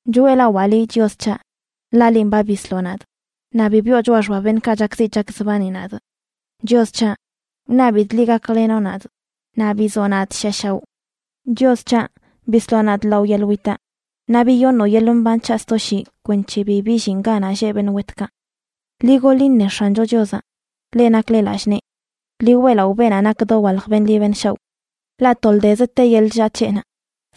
Choeꞌlawaa liꞌ, Chios c̱haꞌ, ḻaꞌ linꞌ ba bisloꞌ nadꞌ, naꞌ bi biꞌo choꞌa xba beṉꞌkaꞌ chakziꞌ chakzbani nadꞌ. Chios c̱haꞌ, wṉabidꞌ liꞌ gaklenoꞌ nadꞌ naꞌ bizoꞌ nadꞌ shiꞌa shaoꞌ. Chios c̱haꞌ, bisloꞌ nadꞌ lao yeḻꞌ witaꞌ, naꞌ biyoṉoꞌ yeḻꞌ mban c̱haꞌ sto shii kwenc̱he bi billinꞌ ganaꞌ lleꞌ beṉꞌ wetkaꞌ. Ḻi goḻ iṉe X̱ancho Chiozaꞌ, leꞌ nakle lallꞌ nee. Ḻi weꞌlaꞌo beenaꞌ nak dowalj beṉꞌ ḻi beṉꞌ shaoꞌ. Ḻaꞌ toldezə te yeḻꞌ chllaa c̱heꞌnaꞌ,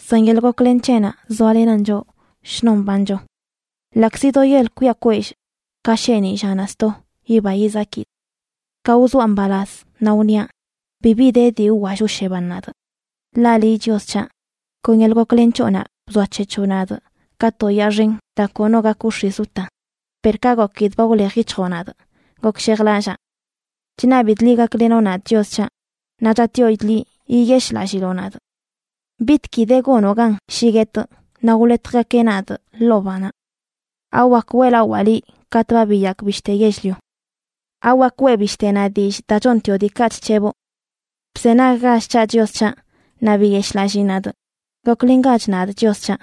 san yeḻꞌ goklen c̱heꞌnaꞌ zoalenan choꞌ shnon mbancho. Ḻaꞌkzi do yel kwiꞌa kwellꞌ, ka sheeniꞌ llanaꞌ sto yiba yizakidꞌ. Ka wzoaꞌ mbalaz, naꞌ wniaꞌ: “Bibi de dii wwall wsheban nadꞌ.” Ḻaꞌ liꞌ, Chios c̱haꞌ, kon yeḻꞌ goklen c̱hoꞌnaꞌ bzoac̱hec̱hoꞌ nadꞌ ka to yaa xen daa kono gak wx̱iz wta. Per ka gokidꞌ ba wlej yic̱hjoꞌ nadꞌ, gokshejlallaa. Chṉabidꞌ liꞌ gaklenoꞌ nadꞌ, Chios c̱haꞌ, naꞌ chatꞌyoidꞌ liꞌ yiyeshꞌlalliloꞌ nadꞌ. ¿Bitgui de gonoꞌ gan shi guetꞌ naꞌ wḻetjgakeꞌ nadꞌ ḻoo banaꞌ? ¿Awak weꞌlawaa liꞌ katꞌ ba biyakꞌ bishte yell-lio? ¿Awak weꞌ bishtenaꞌ dillꞌ daa chontioꞌ diikaꞌ chc̱heboꞌ? Bzenaggach c̱haꞌ, Chios c̱haꞌ, naꞌ biyeshꞌlallii nadꞌ. Goklengach nadꞌ, Chios c̱haꞌ.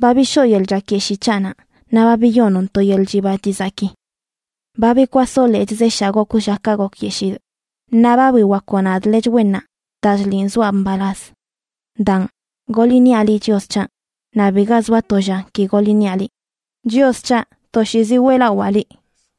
Ba bishoo yeḻꞌ chakyeshii c̱haꞌnaꞌ naꞌ ba biyonoꞌn to yeḻꞌ chiba chizaki. Ba bikwasoꞌ lechꞌ zeshaa gokwꞌ llakaꞌ gokyeshidꞌ, naꞌ ba biwakoꞌ nadꞌ lechꞌ wennaꞌ daa chliꞌn zoa mbalaz. Daan, goḻ iṉiaꞌ liꞌ, Chios c̱haꞌ, naꞌ biga zoa to lla ki goḻ iṉiaꞌ liꞌ. Chios c̱haꞌ, toshiizi weꞌlawaa liꞌ.